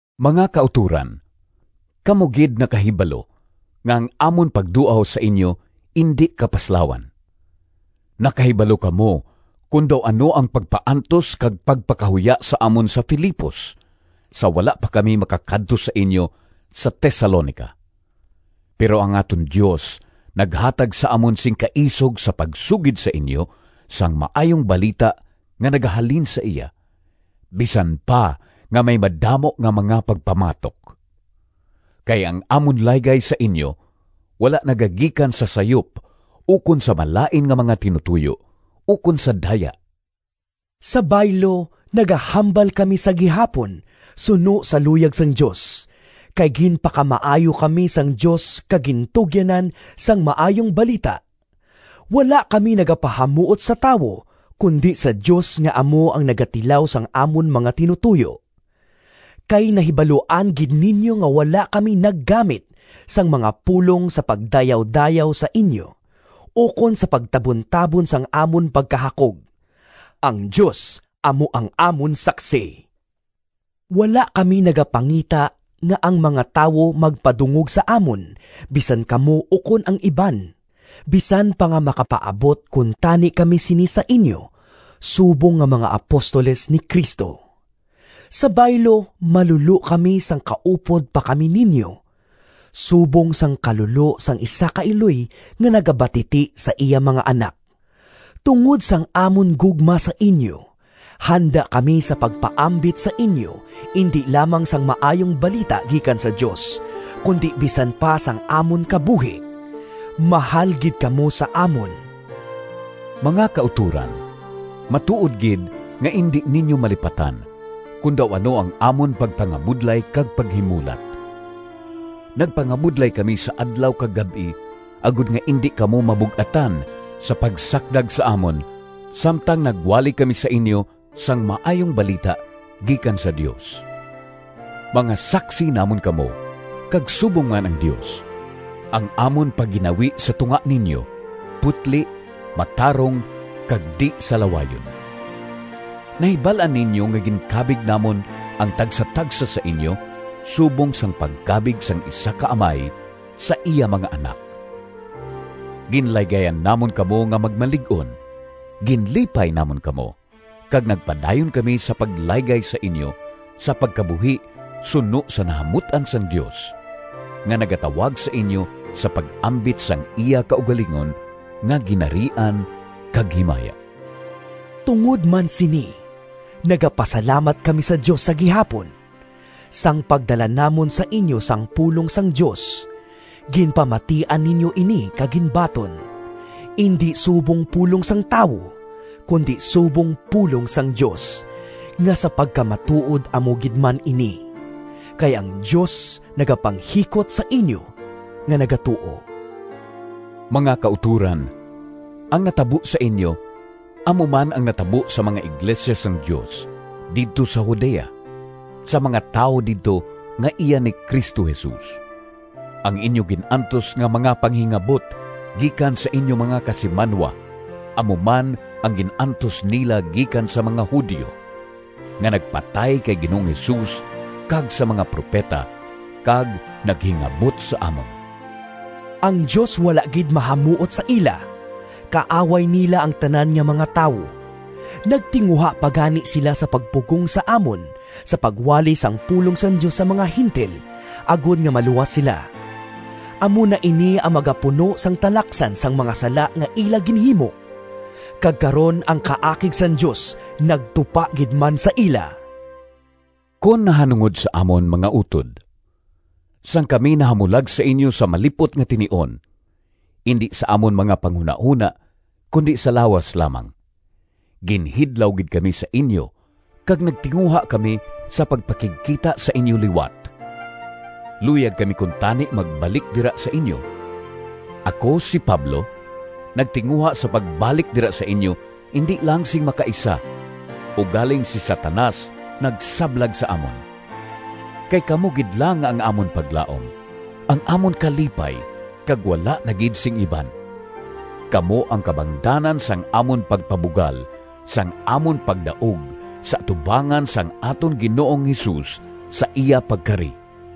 Mga kautoran, kamo gid nakahibalo nga ang amon pagduaw sa inyo indi kapaslawan. Nakahibalo kamo kon daw ano ang pagpaantos kag pagpakahuya sa amon sa Filipos sa wala pa kami makakadto sa inyo sa Tesalonica. Pero ang aton Dios naghatag sa amon sing kaisog sa pagsugid sa inyo sang Maayong Balita nga nagahalin sa iya, bisan pa nga may madamo nga mga pagpamatok. Kay ang amon laygay sa inyo wala nagagikan sa sayop ukon sa malain nga mga tinutoyo, ukon sa daya. Sa baylo, nagahambal kami sa gihapon suno sa luyag sang Dios, kay ginpakamaayo kami sang Dios kag gintugyanan sang Maayong Balita. Wala kami nagapahamuot sa tawo, kundi sa Dios nga amo ang nagatilaw sang amon mga tinutoyo. Kay nahibaluan gid ninyo nga wala kami naggamit sang mga pulong sa pagdayawdayaw sa inyo, ukon sa pagtabuntabon sang amon pagkahakog. Ang Dios amo ang amon saksi! Wala kami nagapangita nga ang mga tawo magpadungog sa amon, bisan kamo ukon ang iban, bisan pa nga makapaabot kuntani kami sini sa inyo subong nga mga apostoles ni Cristo. Sa baylo, malulo kami sang kaupod pa kami ninyo, subong sang kalulo sang isa ka iloy nga nagabatiti sa iya mga anak. Tungod sang amon gugma sa inyo, handa kami sa pagpaambit sa inyo indi lamang sang Maayong Balita gikan sa Dios, kundi bisan pa sang amon kabuhi. Mahal gid kamo sa amon! Mga kautoran, matuod gid nga indi ninyo malipatan kon daw ano ang amon pagpangabudlay kag paghimulat! Nagpangabudlay kami sa adlaw kag gab-i agod nga indi kamo mabug-atan sa pagsakdag sa amon samtang nagwali kami sa inyo sang Maayong Balita gikan sa Dios. Mga saksi namon kamo, kag subong man ang Dios: ang amon pagginawi sa tunga ninyo putli, matarong, kag di-salawayon. Nahibal-an ninyo nga ginkabig namon ang tagsatagsa sa inyo subong sang pagkabig sang isa ka amay sa iya mga anak. Ginlaygayan namon kamo nga magmalig-on, ginlipay namon kamo, kag nagpadayon kami sa paglaygay sa inyo sa pagkabuhi suno sa nahamut-an sang Dios, nga nagatawag sa inyo sa pag-ambit sang iya kaugalingon nga Ginharian kag himaya. Tungod man sini, nagapasalamat kami sa Dios sa gihapon. Sang pagdala namon sa inyo sang pulong sang Dios, ginpamatian ninyo ini kag ginbaton, indi subong pulong sang tawo, kundi subong pulong sang Dios, nga sa pagkamatuod amo gid man ini. Kay ang Dios nagapanghikot sa inyo nga nagatuo. Mga kautoran, ang natabo sa inyo amo man ang natabo sa mga iglesia sang Dios didto sa Judea, sa mga tawo didto nga iya ni Cristo Jesus. Ang inyo gin-antos nga mga panghingabot gikan sa inyo mga kasimanwa, amo man ang gin-antos nila gikan sa mga Judio, nga nagpatay kay Ginoong Jesus kag sa mga propeta, kag naghingabot sa amon. Ang Dios wala gid mahamuot sa ila! Kaaway nila ang tanan nga mga tawo! Nagtinguha pa gani sila sa pagpugong sa amon sa pagwali sang pulong sang Dios sa mga Gentil agod nga maluwas sila. Amo na ini ang magapuno sang talaksan sang mga sala nga ila ginhimo. Kag karon ang kaakig sang Dios nagtupa gid man sa ila! Kon nahanungod sa amon, mga utod, sang kami nahamulag sa inyo sa malip-ot nga tinion (indi sa amon mga panghunahona kundi sa lawas lamang), ginhidlaw gid kami sa inyo kag nagtinguha kami sa pagpakigkita sa inyo liwat! Luyag kami kuntani magbalik dira sa inyo. Ako, si Pablo, nagtinguha sa pagbalik dira sa inyo indi lang sing makaisa, ugaling si Satanas nagsablag sa amon. Kay kamo gid lang ang amon paglaom, ang amon kalipay, kag wala na gid sing iban. Kamo ang kabangdanan sang amon pagpabugal sang amon pagdaog sa atubangan sang aton Ginoong Jesus sa iya pagkari.